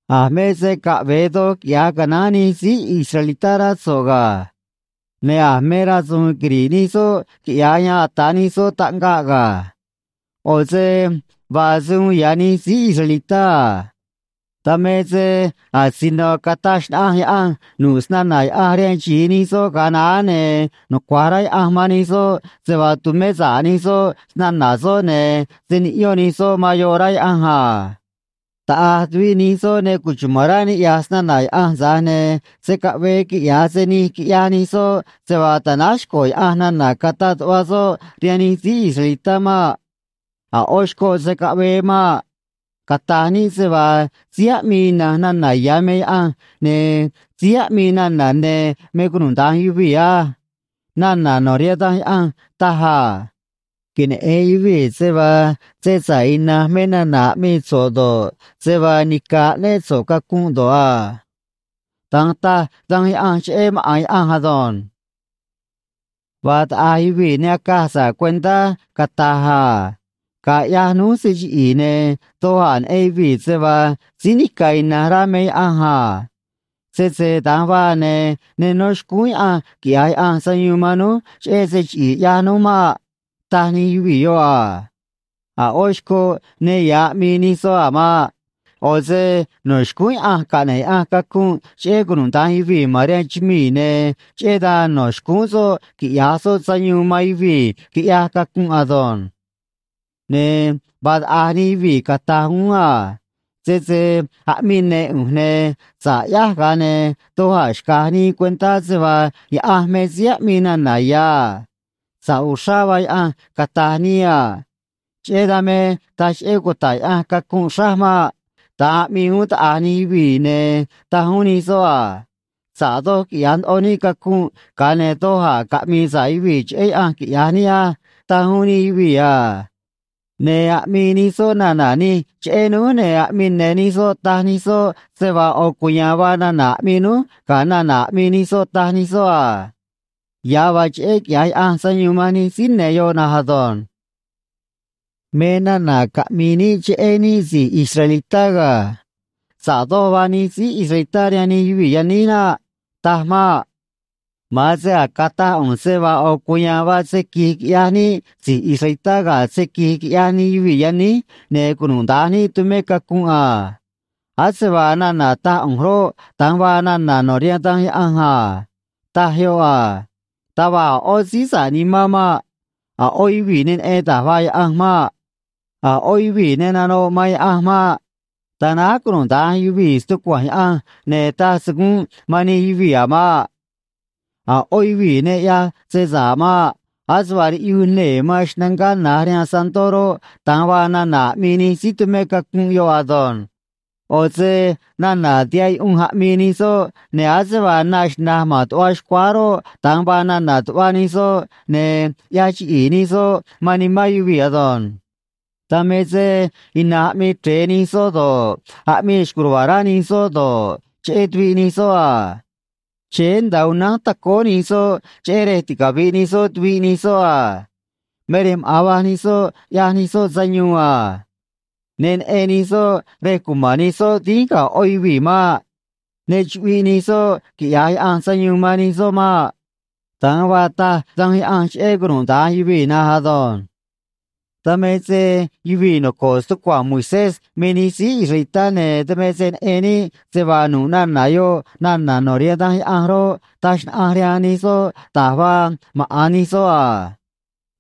A̱ me se caꞌve̱e doj quiꞌya̱j canaán nij síí israelitá, rá so̱ꞌ ga̱. Ne̱ a̱ me rasu̱u̱n quiri̱ꞌ nij soꞌ quiꞌya̱j yan ata̱ nij soꞌ taꞌngaꞌ ga̱. ꞌO̱ se vaa se uun ya̱ nij síí israelitá a. Dan me se asino cataj xnaꞌanj Yaꞌanj nu̱ꞌ snana̱ Yaꞌanj rihaan xi̱i nij soꞌ ga̱a naá, ne̱ nucua̱j rá Yaꞌanj man nij soꞌ se vaa tu̱mé sa̱ꞌ nij soꞌ snana̱ soꞌ, ne̱ se̱ niꞌyón nij soꞌ man yoꞌ, rá Yaꞌanj a. Taꞌa̱j tuviꞌ nij soꞌ ne cuchuma̱n rá ni̱ꞌyaj snana̱ Yaꞌanj, tza̱j ne̱ se̱ caꞌvee quiꞌya̱j se nij quiꞌyaj nij soꞌ se vaa ta̱náj xco̱ Yaꞌanj nana̱ cataꞌ tuꞌva soꞌ rihaan nij síí israelitá maꞌ. A̱ ꞌó xcoꞌ se̱ caꞌvee maꞌ. Cata̱j níꞌ se vaa síí aꞌmii ina̱nj nana ya̱ me Yaꞌanj, ne̱ síí aꞌmii nana̱ ne̱ me cunuda̱nj yuvii̱ á. Nana̱ no̱ rihaan Da̱nj Yaꞌanj taj a: Queneꞌe̱n yuvii̱ se vaa se sa̱ꞌ inanj me nana aꞌmii so̱ꞌ do̱ꞌ, se vaa nica̱ aꞌnéꞌ so̱ꞌ cacunꞌ do̱ꞌ a. Da̱nj taj Danj Yaꞌanj cheꞌé maꞌa̱n Yaꞌanj ado̱nj. Vaa taꞌa̱j yuvii̱ ne acaj sa̱ꞌ cuentá cata̱j a: “Ga̱a ꞌyaj núj se chiꞌi̱i̱, ne̱ doj a̱ neꞌen yuvii̱ se vaa síí nica̱ ina̱nj rá me Yaꞌanj a. Sese da̱nj vaa, ne̱ ne nó xcúún Yaꞌanj quiꞌya̱j Yaꞌanj sayuun man núj cheꞌé se chiꞌi̱i̱ ꞌyaj núj maꞌ”, taj nij yuvii̱ yoꞌ a. A̱ ꞌó xcoꞌ ne ya̱ aꞌmii nij soꞌ a̱ maꞌ. ꞌO̱ se no̱ xcúún Yaꞌanj caꞌne̱ꞌ Yaꞌanj cacunꞌ cheꞌé cunuda̱nj yuvii̱ ma̱n rihaan chumii̱, ne̱ cheꞌé dan no̱ xcúún soꞌ quiꞌya̱j soꞌ sayuun man yuvii̱ quiꞌyaj cacunꞌ ado̱nj. Ne̱ vaa taꞌa̱j nij yuvii̱ cata̱j uún a: “Sese aꞌmii ne̱ ꞌu̱nj, ne̱ sa̱ꞌ ꞌyáj, ga̱a ne̱ doj a̱ xca̱j nii cuentá se vaa Yaꞌanj me síí aꞌmii nana̱ ya̱ a. Sa̱ꞌ uxrá vaa Yaꞌanj, cata̱j nii a. Cheꞌé dan me taj cheꞌé cuta̱ꞌ Yaꞌanj cacunꞌ xráj maꞌ.” Da̱nj aꞌmii uún taꞌa̱j nij yuvii̱, ne̱ taj uún nij soꞌ a: “Sa̱ꞌ doj quiꞌya̱j ndoꞌo níꞌ cacunꞌ, ga̱a ne̱ doj a̱ caꞌmi̱i̱ sa̱ꞌ yuvii̱ cheꞌé Yaꞌanj, quiꞌya̱j níꞌ á”, taj uún nij yuvii̱ a. Ne̱ aꞌmii nij soꞌ nana̱ nij cheꞌé núj, ne̱ aꞌmii ne̱ nij soꞌ taj nij soꞌ se vaa ꞌo̱ cuya̱a̱n vaa nana̱ aꞌmii núj ga̱ nana̱ aꞌmii nij soꞌ, taj nij soꞌ a. Ya̱ vaa cheꞌé quiꞌya̱j Yaꞌanj sayuun man nij síí ne̱ yoꞌ na̱nj ado̱nj. Me nana̱ caꞌmi̱i̱ níꞌ cheꞌé níꞌ si̱j israelitá ga̱. Sa̱ꞌ doj vaa nij síí israelitá rihaan nij yuvii̱ yaníj naꞌ. Taj maꞌ. Ma̱an se a̱j cataj ꞌu̱nj se vaa ꞌo̱ cuya̱a̱n vaa se qui̱j quiꞌyaj níꞌ si̱j israelitá ga̱ se qui̱j quiꞌyaj nij yuvii̱ yaníj, ne̱ cunuda̱nj níꞌ tumé cacunꞌ a. Ase vaa nana̱ taj ꞌu̱nj roꞌ, da̱nj vaa nana̱ no̱ rihaan Danj Yaꞌanj a. Taj yoꞌ a: Taj va̱j a̱ ꞌó síí sa̱ꞌ nimán maꞌ. A̱ ꞌó yuvii̱ ne neꞌen da̱j vaa Yaꞌanj maꞌ. A̱ ꞌó yuvii̱ ne nanoꞌ man Yaꞌanj maꞌ. Tanáj cunuda̱nj yuvii̱ stucua̱nj Yaꞌanj, ne̱ taj se gúnꞌ man nij yuvii̱ a̱ maꞌ. A̱ ꞌó yuvii̱ ne ꞌyaj se sa̱ꞌ maꞌ. Ase vaa riꞌyuj nee̱ man xnangá na̱j rihaan santó roꞌ, da̱nj vaa nana̱ aꞌmii nij síí tumé cacunꞌ yoꞌ ado̱nj. ꞌO̱ se nana̱ tihaꞌ yuꞌunj aꞌmii nij soꞌ, ne̱ ase vaa na xna̱j ma̱n tuꞌva xcuáá roꞌ, da̱nj vaa nana̱ tuꞌva nij soꞌ, ne̱ ꞌyaj chiꞌi̱i̱ nij soꞌ man nimán yuvii̱ ado̱nj. Dan me se ina̱nj aꞌmii chre̱e nij soꞌ do̱ꞌ, aꞌmii xco̱j ruva̱a̱ rá nij soꞌ do̱ꞌ, cheꞌé tuviꞌ nij soꞌ a. Chéé nda̱a unánj tacóó nij soꞌ, cheꞌé rej ticavi̱ꞌ nij soꞌ tuviꞌ nij soꞌ a. Me rej maꞌa̱n va̱j nij soꞌ ꞌyaj nij soꞌ sayuun a. Ne neꞌen nij soꞌ rej cuma̱n nij soꞌ dínj ga̱ ꞌó yuvii̱ maꞌ. Ne chuꞌviꞌ nij soꞌ quiꞌya̱j Yaꞌanj sayuun man nij soꞌ maꞌ. Da̱nj vaa taj Danj Yaꞌanj cheꞌé cunuda̱nj yuvii̱ na̱nj ado̱nj. Dan me se yuvii̱ noco̱ꞌ stucua̱nj Moisés me nij síí israelitá, ne̱ dan me se neꞌen níꞌ se vaa nu̱ꞌ nana̱ yoꞌ nana̱ no̱ rihaan Danj Yaꞌanj roꞌ, taj xnaꞌanj rihaan nij soꞌ da̱j vaa maꞌa̱n nij soꞌ a.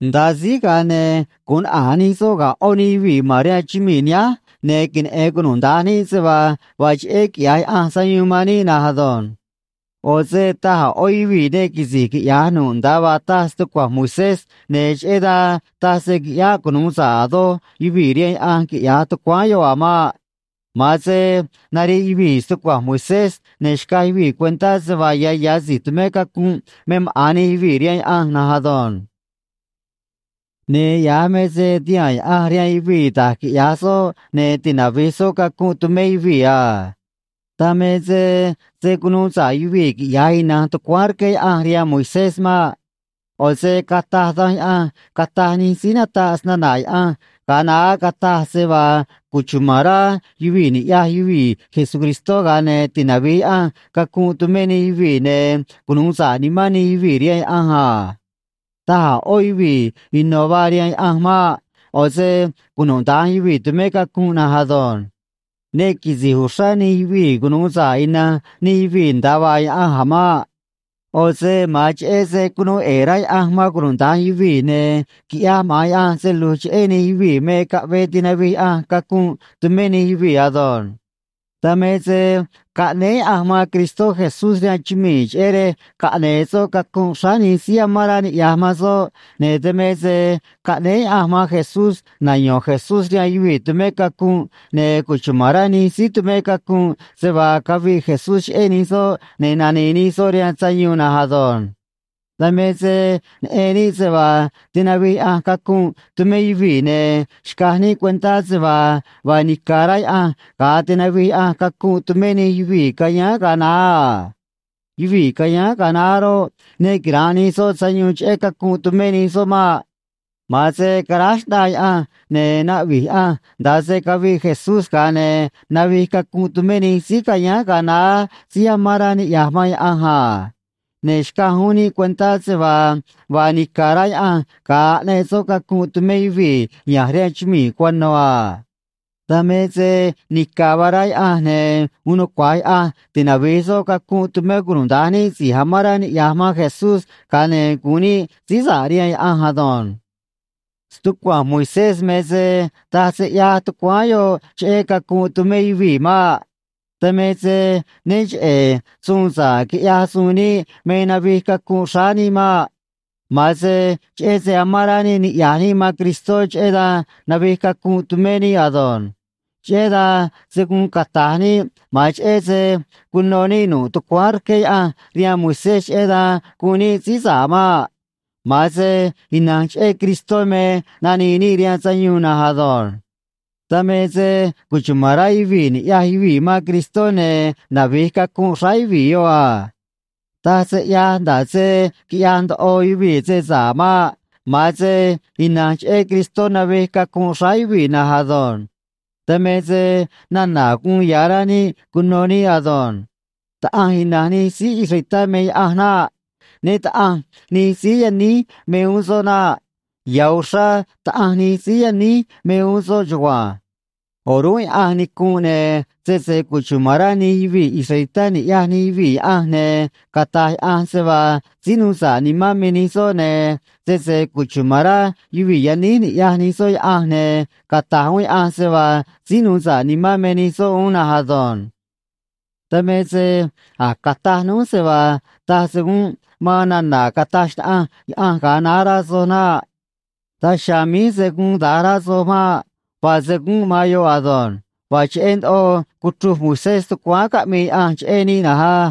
Nda̱a síj, ga̱a ne̱ gu̱un naꞌa̱j nij soꞌ ga̱ ꞌó nij yuvii̱ ma̱n rihaan chumii̱ nihánj, ne̱ queneꞌe̱n cunuda̱nj níꞌ se vaa vaa cheꞌé quiꞌya̱j Yaꞌanj sayuun man níꞌ na̱nj ado̱nj. ꞌO̱ se taj a̱ ꞌó yuvii̱ ne quisi̱j quiꞌya̱j nu̱ꞌ nda̱a vaa taj stucua̱nj Moisés, ne̱ cheꞌé dan taj se qui̱ꞌyáꞌ cunu̱u sa̱ꞌ a̱ doj yuvii̱ rihaan Yaꞌanj quiꞌya̱j tucuáán yoꞌ a̱ maꞌ. Ma̱an se nariꞌ yuvii̱ stucua̱nj Moisés, ne̱ xcaj yuvii̱ cuentá se vaa ya̱ ya̱ si̱j tumé cacunꞌ me maꞌa̱n nij yuvii̱ rihaan Yaꞌanj na̱nj ado̱nj. Ne̱ ya̱j me se tihaa̱n Yaꞌanj rihaan yuvii̱ da̱j quiꞌya̱j soꞌ ne̱ tinavi̱j soꞌ cacunꞌ tumé yuvii̱ a. Dan me se se̱ cunuu sa̱ꞌ yuvii̱ quiꞌya̱j ina̱nj tucuáán rqué Yaꞌanj rihaan Moisés maꞌ. ꞌO̱ se cataj Danj Yaꞌanj cataj nij síí nataꞌ snana̱ Yaꞌanj ga̱a naá cataj se vaa cuchuma̱n rá yuvii̱ ni̱ꞌyaj yuvii̱ Jesucristó, ga̱a ne̱ tinavi̱j Yaꞌanj cacunꞌ tumé nij yuvii̱, ne̱ cunu̱u sa̱ꞌ nimán nij yuvii̱ rihaan Yaꞌanj a. Taj a̱ ꞌó yuvii̱ ino̱ vaa rihaan Yaꞌanj maꞌ. ꞌO̱ se cunuda̱nj yuvii̱ tumé cacunꞌ na̱nj ado̱nj. Ne quisi̱j uxrá nij yuvii̱ cunu̱u sa̱ꞌ ina̱nj nij yuvii̱ nda̱a vaa Yaꞌanj a̱ maꞌ. ꞌO̱ se ma̱an cheꞌé se cunuu ꞌe̱e̱ rá Yaꞌanj man cunuda̱nj yuvii̱ ne̱ quiꞌyaj maꞌa̱n Yaꞌanj se lu̱j cheꞌé nij yuvii̱ me caꞌvee tinavij Yaꞌanj cacunꞌ tumé nij yuvii̱ ado̱nj. Dan me se caꞌnéé Yaꞌanj man Cristó Jesús rihaan chumii̱, cheꞌé rej caꞌne̱e̱ soꞌ cacunꞌ xráá nij síí amán rá niꞌya̱j man soꞌ, ne̱ dan me se caꞌnéé Yaꞌanj man Jesús nayo̱n Jesús rihaan yuvii̱ tumé cacunꞌ, ne̱ cuchuma̱n rá nij síí tumé cacunꞌ se vaa caviꞌ Jesús cheꞌé nij soꞌ, ne̱ nani̱i̱ nij soꞌ rihaan sayuun na̱nj ado̱nj. Dan me se neꞌen níꞌ se vaa tinavij Yaꞌanj cacunꞌ tumé yuvii̱, ne̱ xcaj níꞌ cuentá se vaa vaa nica̱ rá Yaꞌanj ga̱a tinavij Yaꞌanj cacunꞌ tumé nij yuvii̱ cayáán ga̱a naá a. Yuvii̱ cayáán ga̱a naá roꞌ, ne quira̱nꞌ nij soꞌ sayuun cheꞌé cacunꞌ tumé nij soꞌ maꞌ. Ma̱an se caráj xꞌnaa Yaꞌanj, ne̱ naꞌvi̱j Yaꞌanj nda̱a se caviꞌ Jesús, ga̱a ne̱ navij cacunꞌ tumé nij síí cayáán ga̱a naá síí amán rá niꞌya̱j man Yaꞌanj a. Ne̱ xcaj uún níꞌ cuentá se vaa vaa nica̱ rá Yaꞌanj ga̱a aꞌneꞌ soꞌ cacunꞌ tumé yuvii̱ ya̱nj rihaan chumii̱ cuano̱ a. Dan me se nica̱ vaa rá Yaꞌanj, ne̱ uun nucua̱j Yaꞌanj tinavi̱j soꞌ cacunꞌ tumé cunuda̱nj níꞌ si̱j amán rá niꞌya̱j man Jesús, ga̱a ne̱ gu̱un níꞌ síí sa̱ꞌ rihaan Yaꞌanj ado̱nj. Stucua̱nj Moisés me se taj se ꞌyaj tucuáán yoꞌ cheꞌé cacunꞌ tumé yuvii̱ maꞌ. Dan me se né cheꞌe̱ suun sa̱ꞌ quiꞌyaj suun níꞌ me navij cacunꞌ xráá níꞌ maꞌ. Ma̱an se cheꞌé se amán rá níꞌ niꞌya̱j níꞌ man Cristó, cheꞌé dan navij cacunꞌ tumé níꞌ ado̱nj. Cheꞌé dan se̱ guun cata̱j níꞌ ma̱an cheꞌé se cuno níꞌ nu̱ꞌ tucuáán rqué Yaꞌanj rihaan Moisés, cheꞌé dan guun níꞌ síí sa̱ꞌ maꞌ. Ma̱an se ina̱nj cheꞌé Cristó me nanii níꞌ rihaan sayuun na̱nj ado̱nj. Dan me se cuchuma̱n rá yuvii̱ ni̱ꞌyaj yuvii̱ man Cristó, ne̱ navi̱j cacunꞌ xráá yuvii̱ yoꞌ a. Taj se ꞌyaj nda̱ꞌ se quiꞌyaj ndoꞌo yuvii̱ se sa̱ꞌ maꞌ. Ma̱an se ina̱nj cheꞌé Cristó navij cacunꞌ xráá yuvii̱ na̱nj ado̱nj. Dan me nana̱ guun ya̱ rá níꞌ cuno níꞌ ado̱nj. Taꞌanj ina̱nj nij síí israelitá me Yaꞌanj naꞌ. Né Taꞌa̱nj nij síí yaníj me uún soꞌ naꞌ. Ya̱ uxrá Taꞌanj nij síí yaníj me uún soꞌ chugua̱nj. O̱rúnꞌ Yaꞌanj nicunꞌ, ne̱ sese cuchuma̱n rá nij yuvii̱ israelitá ni̱ꞌyaj nij yuvii̱ Yaꞌanj, ne̱ cata̱j Yaꞌanj se vaa síí nuu sa̱ꞌ nimán me nij soꞌ, ne̱ sese cuchuma̱n rá yuvii̱ yaníj ni̱ꞌyaj nij soꞌ Yaꞌanj, ne̱ cata̱j uún Yaꞌanj se vaa síí nuu sa̱ꞌ nimán me nij soꞌ uún na̱nj ado̱nj. Dan me se a̱j cataj núj se vaa taj se gúnꞌ man nana̱ cataj xnaꞌanj Yaꞌanj ga̱a naá, rá soj naꞌ. Daj chiha̱a̱ míj se̱ guun da̱nj rá soj maꞌ. Vaa se gúnꞌ man yoꞌ ado̱nj. Vaa cheꞌé ndoꞌo cuchruj Moisés tucuáán caꞌmii Yaꞌanj cheꞌé níꞌ na̱nj á.